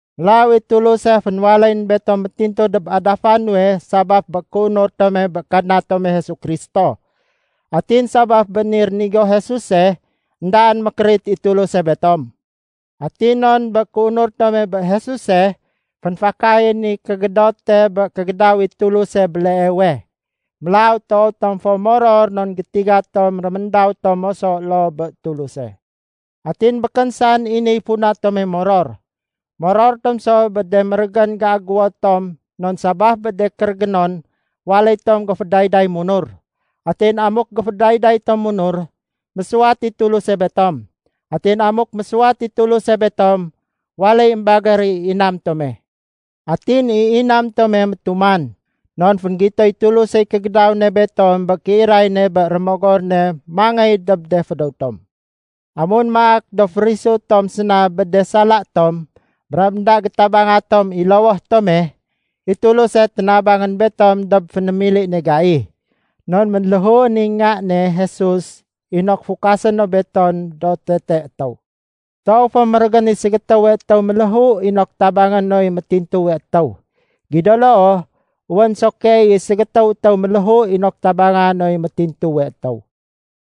Mélaw i Tuluse fénwaléyén betom métintu dob adafa nuwe sabaf bé kéunur tome bé Kadna tome Jesu Kristo. Atin sabaf bé ni rénigo Jesuse, éndaén mékérit i Tuluse betom. Atin non bé kéunur tome bé Jesuse, fénfakayén i kégédote bé kégédaw i Tuluse béleewe. Mélaw toow tom fo moror non gétiga tom réméndaw tom moso loo bé Tuluse. Atin békén saén i niy funa tome moror. Moror tom so bé de mérégén géagéwo tom non sabaf bé de kérégénon, waléy tom géfédayday munur. Atin amuk géfédayday tom munur, mésuwat i Tuluse betom. Atin amuk mésuwat i Tuluse betom, waléy émbagér i inam tome. Atin i inam tome métuman, non fénggitoy Tulusey kégédaw ne betom bé kéiray ne bé Rémogor ne mangéy dob de fédéw tom. Amun maak do férisu tom séna bé de sala tom brab énda gétabanga tom i lowoh tome, i Tuluse ténabangén betom dob fénémili ne gai. Non ménléhuén i Nga ne Jesus inok fukasé no betom do tete étéw. Toow fo mérégén i ségétéwe étéw méléhu inok tabangé noy métintuwe étéw. Gido loo, wén so keey i ségétéw étéw méléhu inok tabangé noy métintuwe étéw.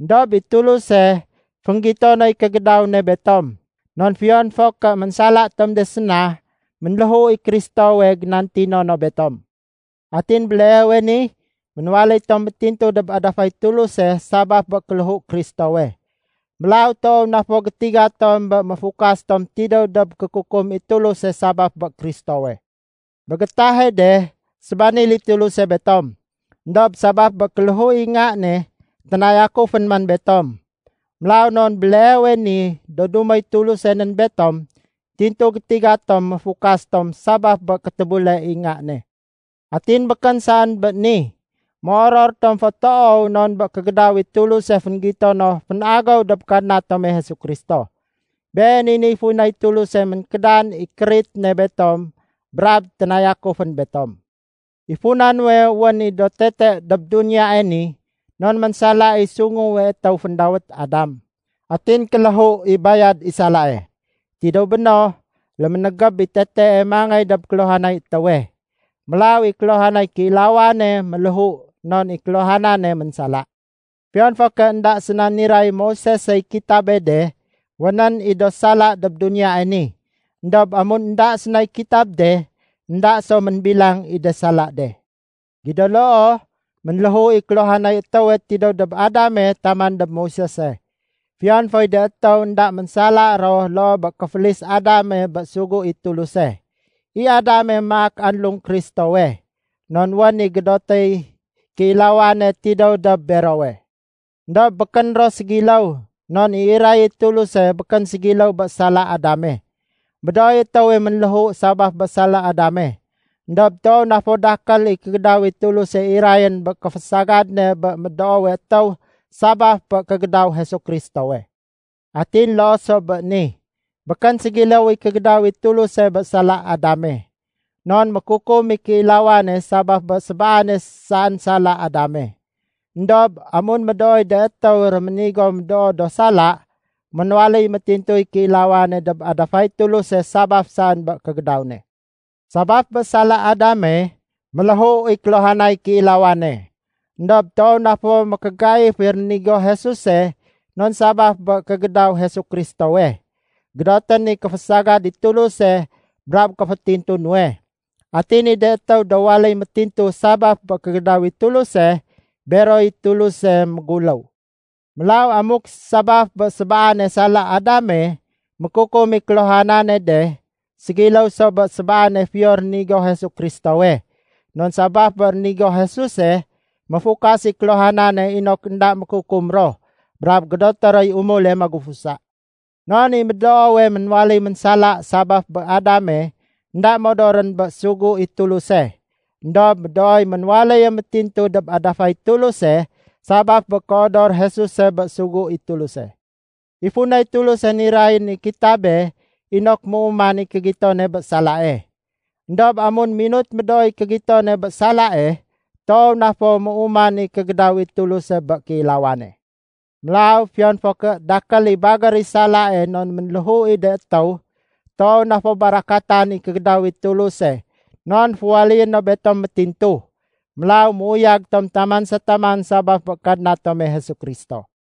Endob i Tuluse, fénggito noy kégédaw ne betom, non fiyon fo ké ménsala tom de séna, ménléhu i Kristowe génantino no betom. Atin béleewe ni, ménwaléy tom métintu dob adafay Tuluse sabaf bé kéléhu Kristowe. Mélaw toow na fo gétiga tom bé méfukas tom tidéw dob kékukum i Tuluse sabaf bé Kristowe. Bé gétahe de, sébanil i Tuluse betom, éndob sabaf bé kéléhu i Nga ne, ténayakufén man betom. Mélaw non béleewe ni do dumoy Tuluse nén betom, tintu gétiga tom méfukas tom sabaf bé kétébule i Nga ne. Atin békén saén bé ni! Méoror tom fo toow non bé kégédaw i Tuluse fénggito no fénagéw dob Kadna tome Jesu Kristo. Been i niy funay Tuluse ménkédan i kérit ne betom brab ténayakufén betom. I funa nuwe wén i do tete dob duniyae ni, non ménsala i sunguwe étéw féndawét Adam. Atin kéléhu i bayad i salae. Tidéw béno, léménégéb i tetee mangéy dob kéluhanay étéwe. Mélaw i kéluhanay kéilawane méléhu non i kéluhanane ménsala. Fiyon fo ké énda séna niray Moisesey kitabe de, wénén i do sala dob duniyae ni. Endob amun énda sénay kitab de, énda so ménbilang i de sala de. Gido loo, ménléhu i kéluhanay étéwe tidéw dob Adame taman dob Moisese, fiyon foy de étéw énda ménsala ro loo bé kéfélis Adame bé sugu i Tuluse. I Adame maak anlung Kristowe non wén i gédotéy kéilawane tidéw dob berowe. Endob békén ro ségiléw non i iray i Tuluse békén ségiléw bé sala Adame. Médooy étéwe ménléhu sabaf bé sala Adame. Endob toow na fo dakél i kégédaw i Tuluse irayén bé kéfésagad ne bé médoowe étéw sabaf bé kégédaw Jesu Kristowe. Atin loo so bé ni, békén ségiléw i kégédaw i Tuluse bé sala Adame. Non mékukum i kéilawane sabaf bé sébaane saén sala Adame. Endob amun médooy de étéw réménigo médoo do sala, ménwaléy métintuy kéilawane dob adafay Tuluse sabaf saén bé kégédaw ne. Sabaf bé sala Adame, méléhu i kéluhanay kéilawane. Endob toow na fo mékégaif i rénigo Jesuse non sabaf bé kégédaw Jesu Kristowe, gédotén i kéfésagad i Tuluse brab kéfétintu nuwe. Atin i de étéw do waléy métintu sabaf bé kégédaw i Tuluse, beroy Tuluse méguléw. Mélaw amuk sabaf bé sébaane sala Adame, mékukum i kéluhanane de, ségiléw so bé sébaane fiyo rénigo Jesu Kristowe. Non sabaf bé rénigo Jesuse, méfukas i kéluhanane inok énda mékukum ro brab gédoté roy umule magufusa. Non i médoowe ménwaléy ménsala sabaf bé Adame énda modorén bé sugu i Tuluse, éndob médooy ménwaléye métintu dob adafay Tuluse sabaf bé kéodor Jesuse bé sugu i Tuluse. I funay Tuluse nirayén i kitabe inok méuman i kégitone bé salae. Endob amun minut médooy kégitone bé salae, toow na fo méuman i kégédaw i Tuluse bé kéilawane. Mélaw fiyon fo ké dakél i bagér i salae non méléhu i de étéw, toow na fo barakatan i kégédaw i Tuluse non féwaléyé no betom métintu. Mélaw méuyag tom taman sa taman sabaf bé Kadna tome Jesu Kristo.